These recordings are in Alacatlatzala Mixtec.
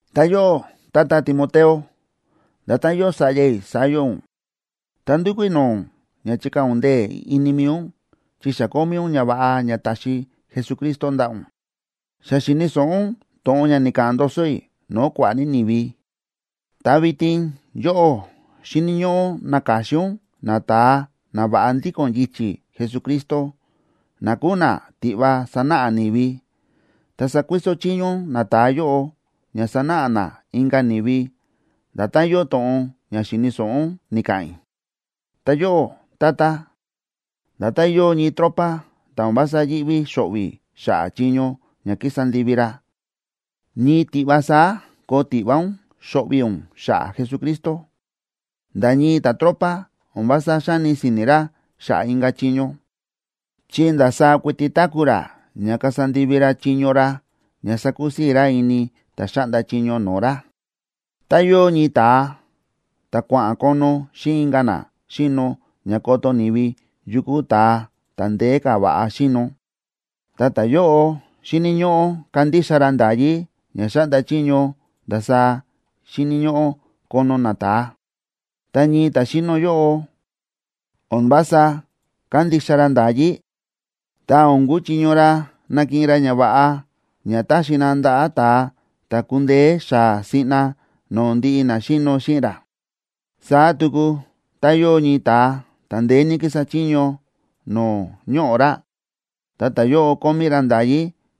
Ta yóꞌó, tata Timoteo, nda̱tán yóo sa̱ꞌya i̱ saá yóo ún, ta ndúkú i̱ no̱o̱ ún ña chikaa̱ ún ndee̱ ini mi̱i ún chi xa kómí ún ñava̱ꞌa ña ta̱xi Jesucristo ndaꞌa̱ ún. Xa xi̱ni̱ so̱ꞌo ún to̱ꞌon ña ni̱ka̱ꞌa̱n ndoso i̱ no̱o̱ kua̱ꞌa̱ ní ni̱vi. Ta vitin yóꞌó xíni̱ ñóꞌó ún naka̱xin ún nata̱a na va̱ꞌa ndíko̱n yichi̱ Jesucristo, na kúu na tiꞌva sanáꞌa ni̱vi. Ta sakuiso chiño ún nata̱a yóꞌo ña sanáꞌa na inka̱ ni̱vi nda̱tán yóo to̱ꞌon ña xi̱ni̱ so̱ꞌo ún ni̱ka̱ꞌa̱n i̱. Ta yóꞌó, tata, nda̱tán yóo ñii tropa ta̱ o̱n vása yíꞌví xo̱ꞌvi̱ xa̱ꞌa̱ chiño ña kísa ndivi ra, ñii ki̱ꞌva saá koo tiꞌva ún xo̱ꞌvi̱ ún xa̱ꞌa̱ Jesucristo. Nda̱ ñii ta̱tropa o̱n vása xáni si̱ni̱ ra xa̱ꞌa̱ inka̱ chiño, chi ndasaá kuiti táku̱ ra ña kasa ndivi ra chiño ra ña sakusii̱ ra ini ta̱ xáꞌnda chiño no̱o̱ ra. Ta yóo ñii ta̱a ta̱ kua̱ꞌa̱n kono xíꞌin inka̱ na xíno ña koto ni̱vi yu kúu ta̱a ta̱ ndeé ka̱ va̱ꞌa xíno, ta ta̱yóꞌo xíni̱ ñóꞌó kandixa ra nda̱yí ña xáꞌnda chiño ndasaá xíni̱ ñóꞌó kono nata̱a. Tá ñii ta̱ xíno yóꞌo, o̱n vása kándixa ra nda̱yí, ta o̱n kúchiño ra nakiꞌin ra ñava̱ꞌa ña táxi na ndaꞌa̱ ta̱a ta̱ ku̱ndeé xaa̱ siꞌna no̱o̱ ndiꞌi na xíno xíꞌin ra. Saá tuku tá yóo ñii ta̱a ta̱ ndeé ní kísa chiño no̱o̱ ñoꞌo̱ ra, ta ta̱yóꞌo kómí ra nda̱yí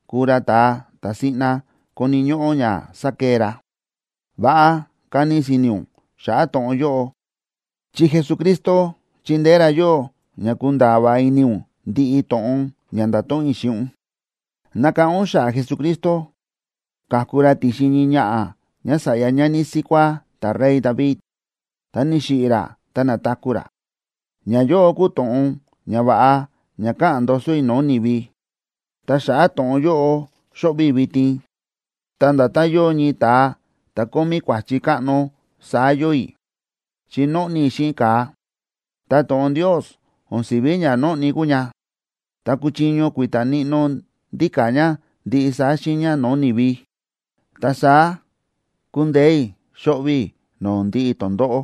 kúu ra ta̱a ta̱ siꞌna koni̱ ñóꞌó ña sa̱kee ra. Va̱ꞌa kani si̱ni̱ ún xa̱ꞌa̱ to̱ꞌon yóꞌo, chi Jesucristo chindeé ra yóꞌó ña kunda̱a̱ va̱ꞌa ini ún ndiꞌi to̱ꞌon ña nda̱to̱ꞌon i̱ xíꞌin ún. Nakáꞌán ún xa̱ꞌa̱ Jesucristo, ka̱ku ra ti̱xin ñii ñaꞌa̱ ñása̱ꞌya ñani síkuá ta̱rey David, ta ni̱xiꞌi̱ ra ta na̱taku̱ ra. Ñayóꞌo kúu to̱ꞌon ñava̱ꞌa ña káꞌa̱n ndoso i̱ no̱o̱ ni̱vi, ta xa̱ꞌa̱ to̱ꞌon yóꞌo xóꞌvi̱ i̱ vitin, ta nda̱tán yóo ñii ta̱a ta̱ kómí kua̱chi káꞌno, saá yóo i̱, chi nóꞌni i̱ xíꞌin ka̱a. Ta to̱ꞌon Ndios o̱n si̱ví ña nóꞌni kúu ña, ta kúchiño kui̱ta̱ níꞌnó ndíka̱ ña ndiꞌi saá xiiña no̱o̱ ni̱vi. Ta saá kúndeé i̱ xóꞌvi̱ i̱ no̱o̱ ndiꞌi tondóꞌó,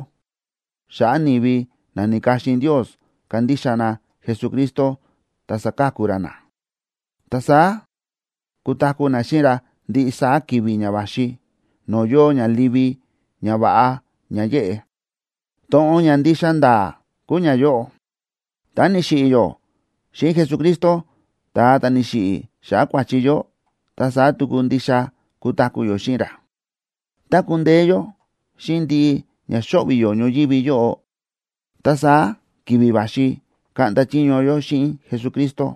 xa̱ꞌa̱ ni̱vi na ni̱ka̱xin Ndios kandixa na Jesucristo ta saka̱ku ra na, ta saá kutaku̱ na xíꞌin ra ndiꞌi saá ki̱vi̱ ña va̱xi no̱o̱ yóo ña livi, ñava̱ꞌa ña yéꞌe. To̱ꞌon ña ndixa nda̱a̱ kúu ñayóꞌo: Tá ni̱xiꞌi̱ yó xíꞌin Jesucristo, ta̱a ta̱ ni̱xiꞌi̱ xa̱ꞌa̱ kua̱chi yó, ta saá tuku ndixa kutaku̱ yó xíꞌin ra. Tá kundeé yó xíꞌin ndiꞌi ña xóꞌvi̱ yó ñoyívi yóꞌo, ta saá ki̱vi̱ va̱xi kaꞌnda chiño yó xíꞌin Jesucristo.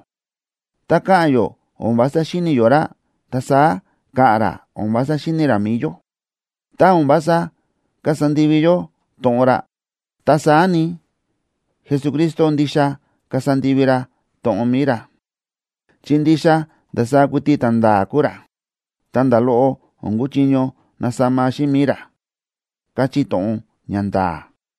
Tá ka̱ꞌa̱n yó o̱n vása xíni̱ yó ra, ta saá ka̱ꞌa̱n ra o̱n vása xíni̱ ra mi̱i yó. Tá o̱n vása kasa ndivi yó to̱ꞌon ra, ta saá ni, Jesucristo ndixa kasa ndivi ra to̱ꞌon mi̱i ra, chi ndixa ndasaá kuiti ta̱nda̱a̱ kúu ra, ta nda̱ loꞌo o̱n kúchiño nasama xíꞌin mi̱i ra, káchí to̱ꞌon ña nda̱a̱.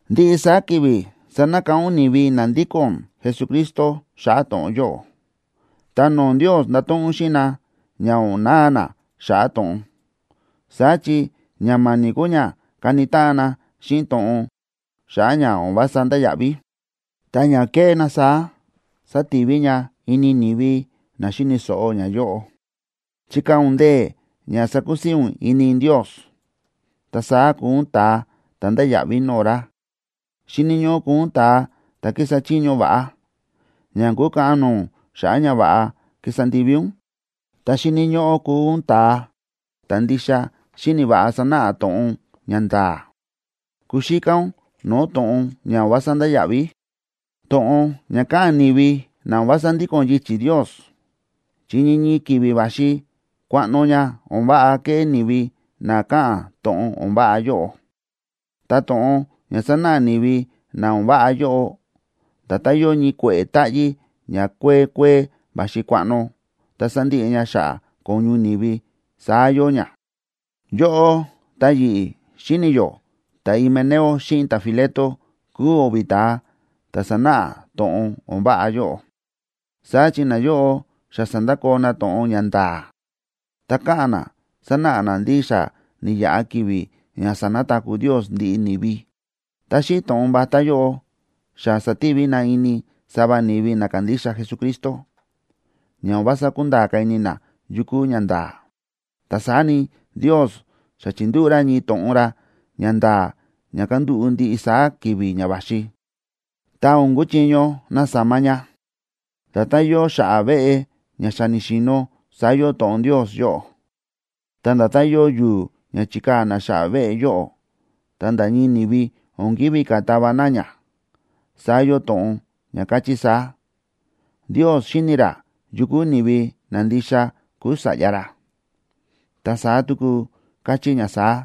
Ndiꞌi saá ki̱vi̱ sanakáꞌán ún ni̱vi na ndíko̱n Jesucristo xa̱ꞌa̱ to̱ꞌon yóꞌo. Ta no̱o̱ Ndios ndato̱ꞌon ún xíꞌin na ña o̱n na̱a na xa̱ꞌa̱ to̱ꞌon. Saá chi ña ma̱ni̱ kúu ña káni táꞌan na xíꞌin to̱ꞌon xa̱ꞌa̱ ña o̱n vása ndáya̱ꞌví, ta ña kéꞌé na saá sativi ña ini ni̱vi na xíni̱ so̱ꞌo ñayóꞌo. Chikaa̱ ún ndee̱ ña sakusii̱ ún ini Ndios, ta saá kuu ún ta̱a ta̱ ndáya̱ꞌví no̱o̱ ra. Xíni̱ ñóꞌó kuu ún ta̱a ta̱ kísa chiño va̱ꞌa, ña o̱n kukaꞌan no̱o̱ ún xa̱ꞌa̱ ñava̱ꞌa ki̱sa ndivi ún. Ta xíni̱ ñóꞌó kuu ún ta̱a ta̱ ndixa xíni̱ va̱ꞌa sánáꞌa to̱ꞌon ña nda̱a̱. Kuxíká ún no̱o̱ to̱ꞌon ña o̱n vása ndáya̱ꞌví, to̱ꞌon ña káꞌa̱n ni̱vi na o̱n vása ndíko̱n yichi̱ Ndios, chi ñii ñii ki̱vi̱ va̱xi kuaꞌno ña o̱n váꞌa keꞌé ni̱vi na káꞌa̱n to̱ꞌon o̱n váꞌa yóꞌo. Ta to̱ꞌon ña sánáꞌa ni̱vi na o̱n váꞌa yóꞌo, nda̱tán yóo ñii kue̱ꞌe̱ táꞌyí ña kuee kuee va̱xi kuaꞌno, ta sándiꞌi ña xa̱ꞌa̱ ko̱ñu ni̱vi saá yóo ña. Yóꞌó ta yi̱ꞌi̱ xíni̱ yó ta̱Himeneo xíꞌin ta̱Fileto kúu o̱vi̱ ta̱a ta̱ sánáꞌa to̱ꞌon o̱n váꞌa yóꞌo. Saá chi nayóꞌo xa sa̱ndakoo na to̱ꞌon ña nda̱a̱, ta káꞌa̱n na sánáꞌa na ndí xa ni̱yaꞌa ki̱vi̱ ña sa̱nataku̱ Ndios ndiꞌi ni̱vi. Ta xíꞌin to̱ꞌon vatá yóꞌo xa sa̱tivi na ini sava ni̱vi na kándixa Jesucristo, ña o̱n vása kúnda̱a̱ ka̱ ini na yu kúu ñanda̱a̱. Ta saá ni, Ndios xa chi̱ndúꞌu̱ ra ñii to̱ꞌon ra ña nda̱a̱ ña kandúꞌu̱ ndiꞌi saá ki̱vi̱ ña va̱xi, ta o̱n kuchiño nasama ña. Nda̱tán yóo xa̱ꞌa̱ veꞌe ña xa ni̱xi̱no̱ saá yóo to̱ꞌon Ndios yóꞌo. Ta nda̱tán yóo yu̱u̱ ña chi̱kaa̱ na xa̱ꞌa̱ veꞌe yóꞌo, ta nda̱ ñii ni̱vi o̱n ki̱ví ka̱ tava na ña, saá yóo to̱ꞌon ña káchí saá: “Ndios xíni̱ ra yu kúu ni̱vi na ndixa kúu sa̱ꞌya ra.” Ta saá tuku kachí ña saá: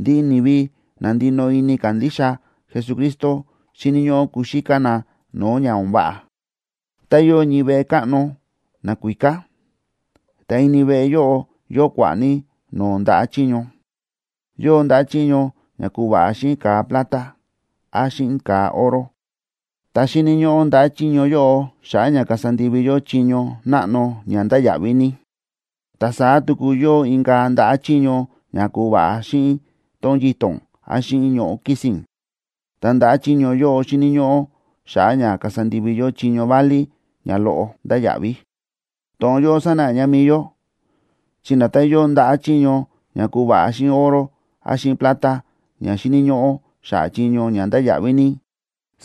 “Ndiꞌi ni̱vi na ndinoꞌo ini kándixa Jesucristo xíni̱ ñóꞌó kuxíká na no̱o̱ ña o̱n váꞌa.” Tá yóo ñii veꞌe káꞌno nakuíká, ta ini veꞌe yóꞌo yóo kua̱ꞌa̱ ní no̱o̱ ndaꞌa̱ chiño. Yóo ndaꞌa̱ chiño ña ku̱va̱ꞌa xíꞌin ka̱a plata, án xíꞌin ka̱a oro. Ta xíni̱ ñóꞌó ndaꞌa̱ chiño yóꞌo xa̱ꞌa̱ ña kasa ndivi yó chiño náꞌno ña ndáya̱ꞌví ní. Ta saá tuku yóo inka̱ ndaꞌa̱ chiño ña ku̱va̱ꞌa xíꞌin tón yito̱n, án xíꞌin ñoꞌo̱ kisín. Ta ndaꞌa̱ chiño yóꞌo xíni̱ ñóꞌó xa̱ꞌa̱ ña kasa ndivi yó chiño válí ña loꞌo ndáya̱ꞌví. To̱ꞌon yóꞌo sánáꞌa mi̱i yó, chi nda̱tán yóo ndaꞌa̱ chiño ña ku̱va̱ꞌa xíꞌin oro án xíꞌin plata ña xíni̱ ñóꞌó xa̱ꞌa̱ chiño ña ndáya̱ꞌví ní,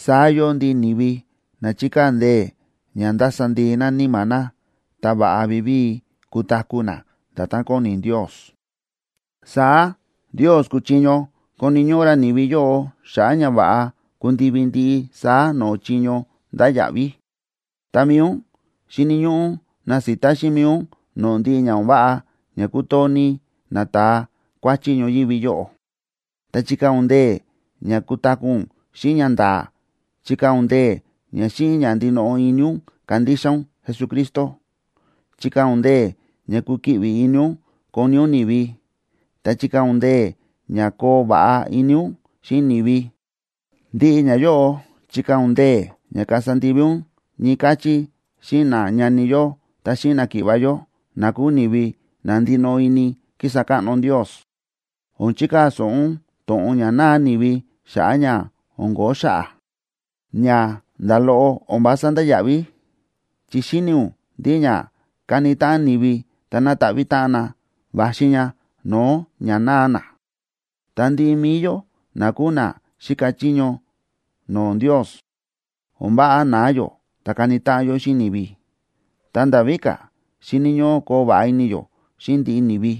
saá yóo ndiꞌi ni̱vi na chíkaa̱ ndee̱ ña ndasa ndii na níma̱ na ta va̱ꞌa vivíi kutaku̱ na nda̱tán kóni Ndios. Saá Ndios kúchiño koni̱ ñóꞌó ra ni̱vi yóꞌo xa̱ꞌa̱ ña va̱ꞌa kundivi ndiꞌi saá no̱o̱ chiño ndáya̱ꞌví. Ta mi̱i ún, xíni̱ ñóꞌó ún nasita xíꞌin mi̱i ún no̱o̱ ndiꞌi ña o̱n váꞌa ña kútoo ní nata̱a kuáchí ñoyívi yóꞌo. Ta chikaa̱ ún ndee̱ ña kutaku̱ ún xíꞌin ñanda̱a̱, chikaa̱ ún ndee̱ ña xíꞌin ña ndinoꞌo ini ún kandixa ún Jesucristo, chikaa̱ ún ndee̱ ña kukiꞌvi ini ún koni ún ni̱vi, ta chikaa̱ ún ndee̱ ña koo va̱ꞌa ini ún xíꞌin ni̱vi. Ndiꞌi ñayóꞌo, chikaa̱ ún ndee̱ ña kasa ndivi ún ñii káchí xíꞌin nañani yó ta xíꞌin náki̱ꞌva̱ yó, na kúu ni̱vi na ndinoꞌo ini kísa káꞌno Ndios. O̱n chikaa̱ so̱ꞌo ún to̱ꞌon ña náa ni̱vi xa̱ꞌa̱ ña o̱n ko̱ó xa̱ꞌa̱, ña nda̱ loꞌo o̱n vása ndáya̱ꞌví, chi xíni̱ ún ndí ña káni táꞌan ni̱vi ta nátaꞌví táꞌan na, va̱xi ña no̱o̱ ña náa na. Ta ndiꞌi mi̱i yó na kúu na xíka chiño no̱o̱ Ndios, o̱n váꞌa na̱a yó ta kani táꞌan yó xíꞌin ni̱vi. Ta nda̱ víka̱, xíni̱ ñóꞌó koo va̱ꞌa ini yó xíꞌin ndiꞌi ni̱vi.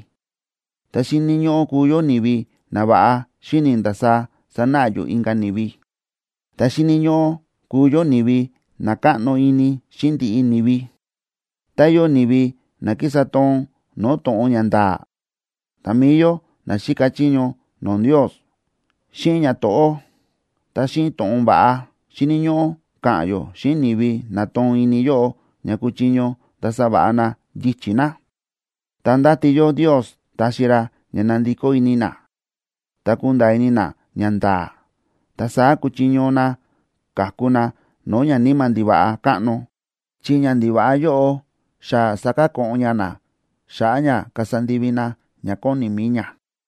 Ta xíni̱ ñóꞌó kuu yó ni̱vi na va̱ꞌa xíni̱ ndasaá sanáꞌa yó inka̱ ni̱vi, ta xíni̱ ñóꞌó kuu yó ni̱vi na káꞌno ini xíꞌin ndiꞌi ni̱vi. Tá yóo ni̱vi na kísa toon no̱o̱ to̱ꞌon ña nda̱a̱, ta mi̱i yó na xíka chiño no̱o̱ Ndios, xíꞌin ñato̱ꞌó ta xíꞌin to̱ꞌon va̱ꞌa, xíni̱ ñóꞌó ka̱ꞌa̱n yó xíꞌin ni̱vi na toon ini yóꞌo ña kuchiño ndasa va̱ꞌa na yichi̱ na. Ta ndáti yó Ndios taxi ra ña nandikó ini na, ta kunda̱a̱ ini na ñanda̱a̱. Ta saá kuchiño na ka̱ku na no̱o̱ ñaníma̱ ndiva̱ꞌa káꞌno, chi ñandiva̱ꞌa yóꞌo xa sa̱kako̱ꞌon ña na xa̱ꞌa̱ ña kasa ndivi na ña kóni mi̱i ña.